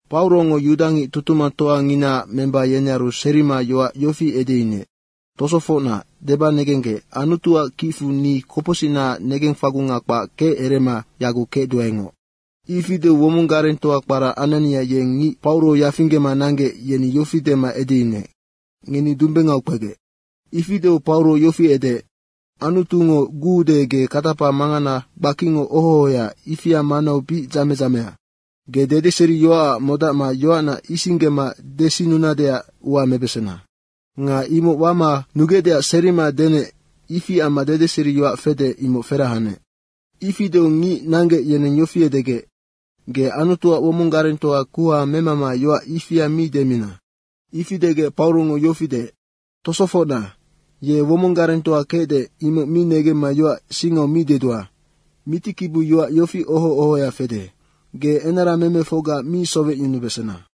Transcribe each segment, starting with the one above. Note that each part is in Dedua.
Paurongo yudangic tutumangtoanginaac memba yenearu serima yoac yofi edeyunuec, “Tosofocna, deba negenggec, Anutuac kicfu ni kopocsicnaac negengfagunga kpac kecerema yaguc kecduaengoc.” Ifi deu womong garengtoa kpara Anania, yeng ngic Pauro yafinggema nanggec, yeni yofi dema edeyunuec, “Ngeni dumbengau kpegec.” Ifi deu Paurongo yofi edeec, “Anutungo guude, ge katapa mangana gbakingo oho ohoya, ifia manau bic dzame dzamea. Ge dedeseriyoacac modacma yoacna isinggema desinnunadeac ua mebesena. Nga imoc wama nugecdeac serima denec, ifi amma dedeseriyoac fede, imoc ferahanec.” Ifi deu ngic nanggec, yeneng yofi edegec, “Ge Anutuac womong garengtoa kuha memama yoac ifia mi demina!” Ifi degec Paurongo yofi deec, “Tosofocna, ye womong garengtoa kecde, imoc mi negemma yoac singau mi dedua. Mitikibiu yofi oho ohoya fede, ‘Ge enaramemefocga mi sowecyunubesena.’”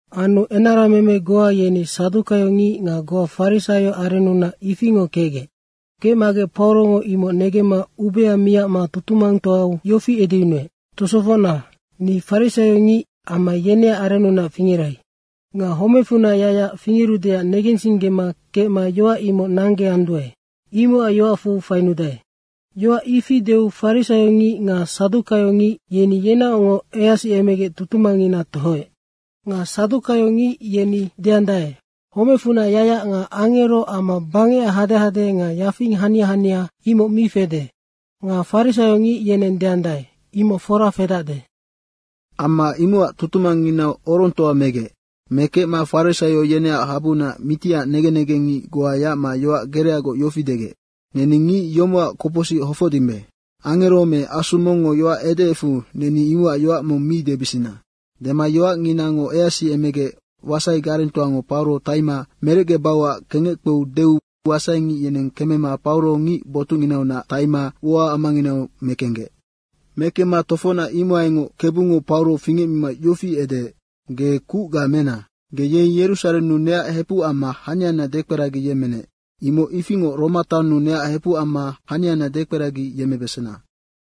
Anu enarameme goa yeni sadukaiongic nga goa farisaio arennunac ifingo kecgec. Kecmagec Paurongo imoc negemma ubea miacma tutumangtoau yofi edeyunuec, “Tosofocna, ni farisaiongic amma yeneac arennunac fingerai. Nga homecfunac yacyac fingerudeac negensinggema kecma yoac imoc nanggeanduae, imocac yoacfu fainudae.” Yoac ifi deu farisaiongic nga sadukaiongic yeni yenaocngoc easiemegec tutumangngina tohoec. Nga sadukaiongic yeni deandae, “Homecfunac yacyac nga angero amma bangecac hadehade nga yafing hania hania, imoc mi fede.” Nga farisaiongic yeneng deandae, “Imoc fora fedacde.” Amma imocac tutumangnginau orongtoa megec. Mekecma farisaio yeneac habuunac mitiac negen negengngic goa yacma yoac gereagoc yofi degec, “Neni ngic yomocac kopocsic hofocdimbe. Angero me asu mongngo yoac edeecfu neni imocac yoac mong mi debisina.” Dema yoacnginango easiemegec wasai garengtoango Pauro taima merecgebauac kengec kpeu deu wasaingic yeneng kemema Pauro ngic botucnginaunac taimama ua amanginau mekenggec. Mekemma tofocnac imohaingoc Kebungo Pauro fingecmima yofi edeec, “Ge kucga mena, ge yei Yerusarennu neac hepuc amma haniana dekperagiyemmenec, imoc ifingoc Roma taonnu neac hepuc amma haniana dekperagiyemmebesena.”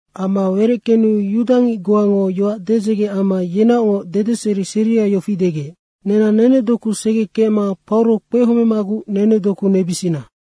Ama wereckenu yudangic goango yoac dedzege amma yenaocngoc dedeseri seria yofi degec, “Nenang nenedoku segekecma Pauro kpehomemaguc nenedoku nebisina.”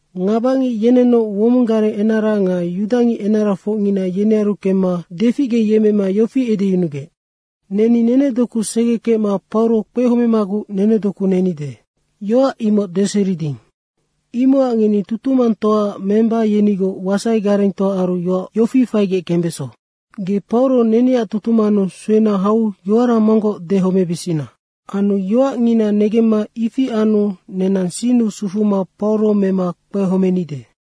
Ngabangic yenennoc womong gareng enara nga yudangic enarafocngina yenearu kemma deficgeyemmema yofi edeyunugec, “Neni nenedoku segekecma Pauro kpehomemaguc nenedoku nenide, yoac imoc deseriding. Imocac ngeni tutumangtoaac memba yenigoc wasai garengtoaaru yoac yofi faigec kembeso, ‘Ge Pauro neneac tutumannu suena hau yoara monggoc dehomebisina.’ Anu yoacngina negemma ifi anu nenang sinnu sufuma Pauro mema kpehomenide.”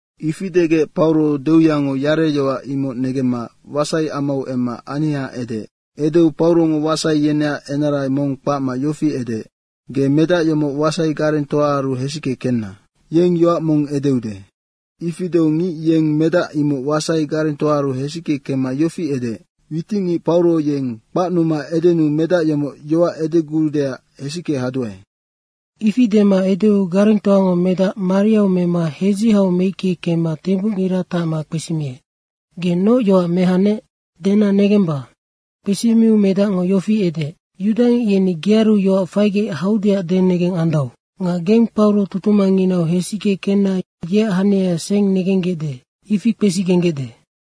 Ifi degec Pauro deuyango yareyoac imoc negemma wasaiamau emma aniha edeec. Edeu Paurongo wasai yeneac enara mong kpacma yofi edeec, “Ge medac yomoc wasaigarengtoaaru hesicke kenna. Yeng yoac mong edeude.” Ifi deu ngic yeng medac imoc wasai garengtoaaru hesicke kemma yofi edeec, “Witicngic Pauro yeng kpacnuma edenuu medac yomoc yoac edeguudeac hesicke haduae.” Ifi dema edeu garengtoango medac mariau mema hedzihau meicke kemma tembucngira tacma kpesimiec, “Ge noc yoac mehanec, dena negemba.” Kpesimiu medacngo yofi edeec, “Yudangic yeni gearu yoac faigec haudeac denegeng andau. Nga geng Pauro tutumangnginau hesicke kenna yeac haniaya seng negenggecde, ifi kpesigenggecde.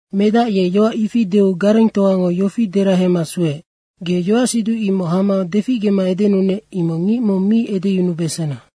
Medac ye yoac ifi deu garengtoango yofi derahema sueec, “Ge yoacsiduc imoc hama deficgema edenunec, imoc ngic mong mi edeyunubesena.”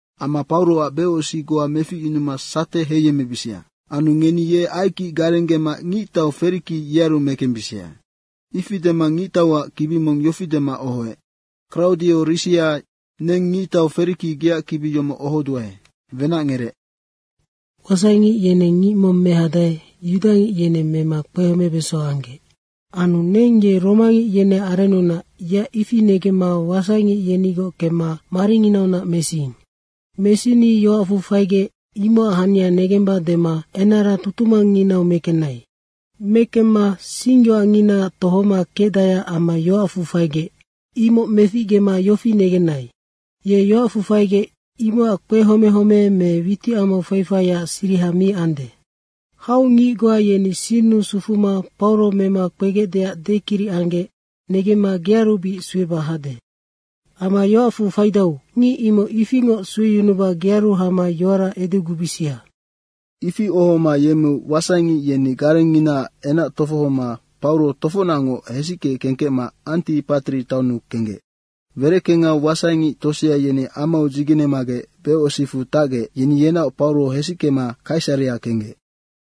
Amma Pauroac becosic goa meficyunuma sate heiyemmebisia. Anu ngeni ye aikic garenggema ngictau Feriki, yearu mekembisia.” Ifi dema ngictauac kibi mong yofi dema ohoec. “Kraudio Risia neng Ngictau Feriki geac kibi yomoc ohoduae. Wenacngerec. Wasaingic yeneng ngic mong mehadae, yudangic yeneng mema kpehomebeso anggec. Anu neng ye romangic yeneac arennunac, yeac ifi negemma wasaingic yenigoc kemma maringinaunac mesiing. Mesini yoacfu faigec, imocac hania negemba dema enara tutumangnginau mekenai. Mekemma singyoacnginaac tohoma kecdaeac amma yoacfu faigec, imoc meficgema yofi negenai, ‘Ye yoacfu faigec, imoc kpehome home me witicamau fai faiac siriha mi ande.’ Hau ngic goa yeni sinnu sufuma Pauro mema kpegecdeac dekiric anggec negemma gearu bic sueba hade. Amma yoacfu faidau, ngic imoc ifingoc sueyunuba gearu hama yoara edegubisia.” Ifi ohoma yemmeu wasaingic yeni garengnginaac enac tofohoma Pauro tofocnacngoc hesicke kengkecma Antipatri taonnu kenggec. Wereckengau wasaingic tosea yeni amau dzigenemagec becosicfu tacgec, yeni yenaoc Pauro hesickema Kaisarea kenggec.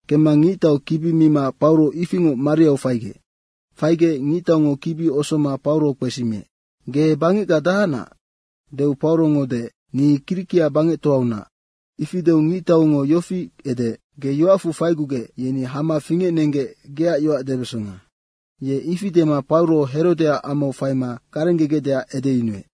Kemma ngictau kibi mima Pauro ifingoc mariau faigec. Faigec ngictaungo kibi osoma Pauro kpesimiec, “Ge Bangecga dahacnac?” deu Paurongo deec, “Ni Kirikia bangectoaunac.” Ifi deu ngictaungo yofi edeec, “Ge yoacfu faigugec, yeni hama fingecnenggec geac yoac debesonga.” Ye ifi dema Pauro Herodeac amau faima garenggegecdeac edeyunuec.